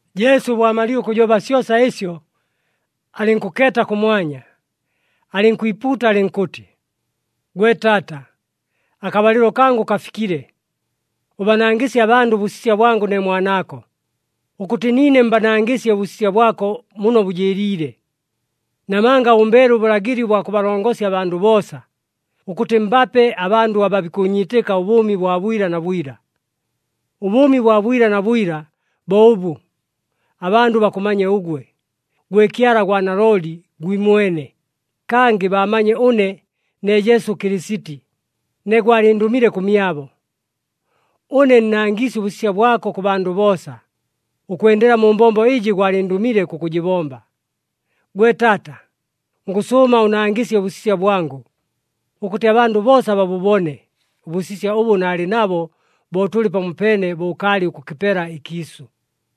Jesu bo amalile ʉkʉjoba syosa ɨsyo, alɨnkʉkeeta kʉmwanya, alɨnkwipuuta alɨnkʉtɨ, “Gwe Taata, akabalɨlo kangʉ kafikile. Ʉbanangɨsye abandʉ ʉbʉsisya bwangʉ ne Mwanaako, ʉkʉtɨ niine mbanangɨsye ʉbʉsisya bwako muno bʉjɨɨliile. Namanga ʉmbeele ʉbʉlagɨli ʉbwa kʉbalongosya abandʉ boosa, ʉkʉtɨ mbape abandʉ aba bikʉʉnyiitɨka ʉbʉʉmi bwa bwila na bwila. Ʉbʉʉmi bwa bwila na bwila bo ʉbʉ, abandʉ bakʉmanye ʉgwe, gwe Kyala gwa nalooli gwimwene, kangɨ baamanye ʉne ne Jesu Kɨlɨsiti, ne gwalɨndʉmile kʉmyabo. Ʉne nnangiisye ʉbʉsisya bwako kʉ bandʉ boosa, ʉkwendela mu mbombo ɨjɨ gwalɨndʉmile kʉkʉjɨbomba. Gwe Taata, ngʉsʉʉma ʉnangɨsye ʉbʉsisya bwangʉ, ʉkʉtɨ abandʉ boosa babʉbone ʉbʉsisya ʉbʉ naalɨ nabo bo tʉlɨ pamopeene, bo ʉkaalɨ ʉkʉkɨpela ɨkiisʉ.”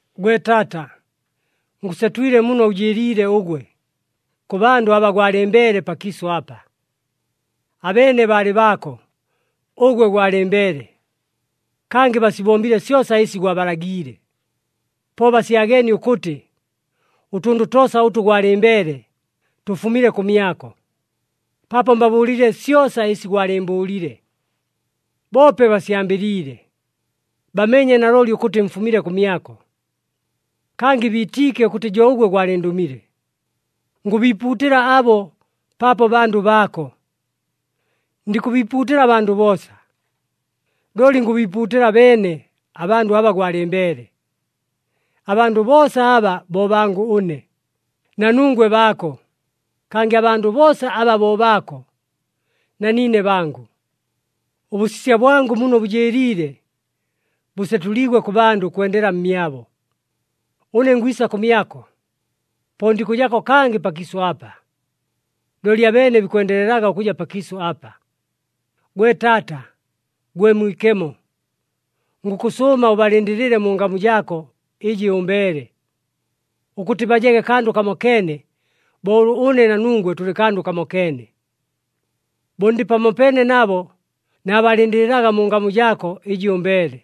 “Gwe Taata, ngʉsetwile muno ʉjɨɨliile ʉgwe, kʉ bandʉ aba gwalɨmbeele pakiisʉ apa. Abeene baalɨ baako, ʉgwe gwalɨmbeele. Kangɨ basibombile syosa ɨsi gwabalagiile. Po basyageenie ʉkʉtɨ ʉtʉndʉ toosa ʉtʉ gwalɨmbeele, tʉfumile kʉmyako, paapo mbabʉʉlile syosa ɨsi gwalɨɨmbʉʉlile. Boope basyambɨliile, bameenye nalooli ʉkʉtɨ mfumile kʉmyako, kangɨ biitiike ʉkʉtɨ jo ʉgwe gwalɨndʉmile. Ngʉbiipuutɨla abo paapo bandʉ baako. Ndikʉbiipuutɨla abandʉ boosa, looli ngʉbiipuutɨla beene abandʉ aba gwalɨmbeele. Abandʉ boosa aba bo bangʉ ʉne, na nungwe baako, kangɨ abandʉ boosa aba bo baako, na niine bangʉ. Ʉbʉsisya bwangʉ muno bʉjɨɨliile, bʉsetʉliigwe kʉ bandʉ ʉkwendela mmyabo. Ʉne ngwisa kʉmyako, po ndikʉjapo kangɨ pakiisʉ apa. Looli abeene bikwendelelaga ʉkʉja pakiisʉ apa. Gwe Taata, gwe Mwikemo, ngʉkʉsʉʉma ʉbalɨndɨlɨle mu ngamu jaako ɨjɨ ʉmbeele, ʉkʉtɨ bajege kandʉ kamokeene bo ʉlʉ ʉne na nungwe tʉlɨ kandʉ kamokeene. Bo ndɨ pamopeene nabo naabalɨndɨlɨlaga mu ngamu jaako ɨjɨ ʉmbeele.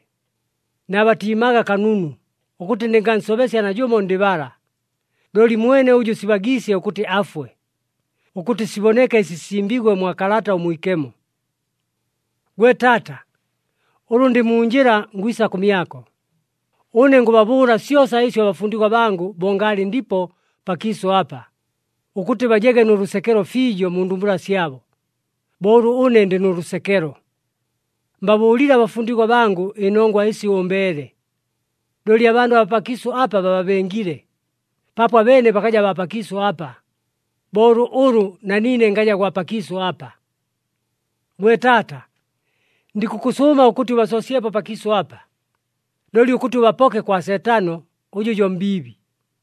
Naabatiimaga kanunu ʉkʉtɨ ndɨngansobesya najʉmo ndɨ bala, looli mwene ʉjʉ sibagiisye ʉkʉtɨ afwe, ʉkʉtɨ siboneke ɨsi sisimbiigwe mwa Kalata ʉMwikemo. “Gwe Taata, ʉlʉ ndɨ mu njɨla ngwisa kʉmyako. Ʉne ngʉbabʉʉla syosa ɨsyo abafundigwa bangʉ bo ngaalɨ ndipo pakiisʉ apa, ʉkʉtɨ bajege nʉ lʉsekelo fiijo mu ndumbula syabo, bo ʉlʉ ʉne ndɨ nʉ lʉsekelo. Mbabʉʉlile abafundigwa bangʉ ɨnongwa ɨsi ʉmbeele. Looli abandʉ abaa pakiisʉ apa bababengile, paapo abeene bakaja baa pakiisʉ apa, bo ʉlʉ na niine ngaja gwa pakiisʉ apa. “Gwe Taata, ndikʉkʉsʉʉma ʉkʉtɨ ʉbasoosyepo pakiisʉ apa, looli ʉkʉtɨ ʉbapoke kwa Seetano, ʉjʉ jo mbiibi.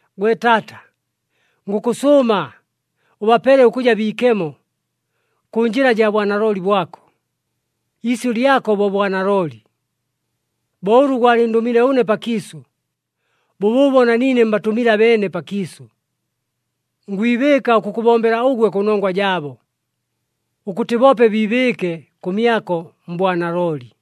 Gwe Taata, ngʉkʉsʉʉma ʉbapele ʉkʉja biikemo, kʉ njɨla jaa bwanalooli bwako. Iisyʉ lyako bo bwanalooli. Bo ʉlʉ gwalɨndʉmile ʉne pakiisʉ, bʉbʉʉbo na niine mbatʉmile abeene pakiisʉ. Ngwibɨɨka ʉkʉkʉbombela ʉgwe kʉnongwa jaabo, ʉkʉtɨ boope biibɨɨke kʉmyako mbwanalooli.”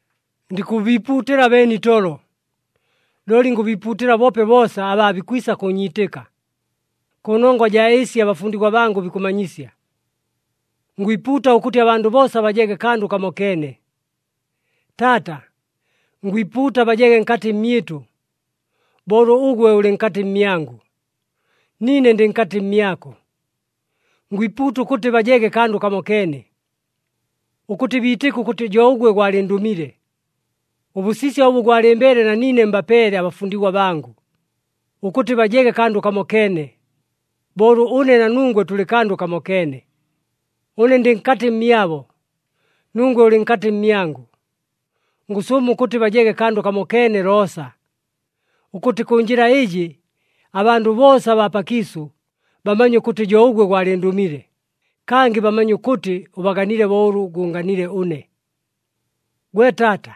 “Ndikʉbiipuutɨla beene itolo, looli ngʉbiipuutɨla boope boosa, aba aabikwisa kʉʉnyiitɨka, kʉnongwa jaa ɨsi abafundigwa bangʉ bikʉmanyisya. Ngwipuuta ʉkʉtɨ abandʉ boosa bajege kandʉ kamokeene. Taata! Ngwipuuta bajege nkatɨ mmyɨtʉ, bo ʉlʉ ʉgwe ʉlɨ nkatɨ mmyangʉ, niine ndɨ nkatɨ mmyako. Ngwipuuta ʉkʉtɨ bajege kandʉ kamokeene, ʉkʉtɨ biitɨke ʉkʉtɨ jo ʉgwe gwalɨndʉmile. Ʉbʉsisya ʉbʉ gwalɨmbeele na niine mbapeele abafundigwa bangʉ, ʉkʉtɨ bajege kandʉ kamokeene, bo ʉlʉ ʉne na nungwe tʉlɨ kandʉ kamokeene. Ʉne ndɨ nkatɨ mmyabo, nungwe ʉlɨ nkatɨ mmyangʉ. Ngʉsʉʉma ʉkʉtɨ bajege kandʉ kamokeene loosa, ʉkʉtɨ kʉ njɨla ɨjɨ abandʉ boosa abaa pakiisʉ bamanye ʉkʉtɨ jo ʉgwe gwalɨndʉmile, kangɨ bamanye ʉkʉtɨ ʉbaganile bo ʉlʉ gʉʉnganile ʉne. “Gwe Taata,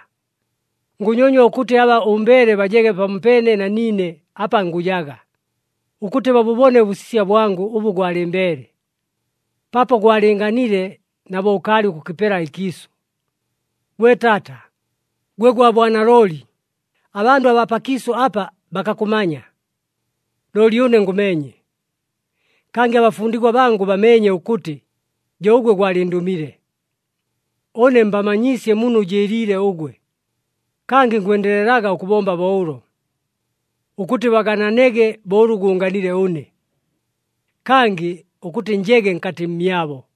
ngʉnyonywa ʉkʉtɨ aba ʉmbeele bajege pamopeene na niine apa ngʉjaga, ʉkʉtɨ babʉbone ʉbʉsisya bwangʉ ʉbʉ gwalɨmbeele, paapo gwalɨɨnganile na bo ʉkaalɨ ʉkʉkɨpela ɨkiisʉ. Gwe Taata, gwe gwa bwanalooli, abandʉ abaa pakiisʉ apa bakakʉmanya. Looli ʉne ngʉmeenye, kangɨ abafundigwa bangʉ bameenye ʉkʉtɨ jo ʉgwe gwalɨndʉmile. Ʉne mbamanyiisye muno ʉjɨɨliile ʉgwe, kangɨ ngwendelelaga ʉkʉbomba bo ʉlo, ʉkʉtɨ bagananege bo ʉlʉ gʉʉnganile ʉne, kangɨ ʉkʉtɨ njege nkatɨ mmyabo.”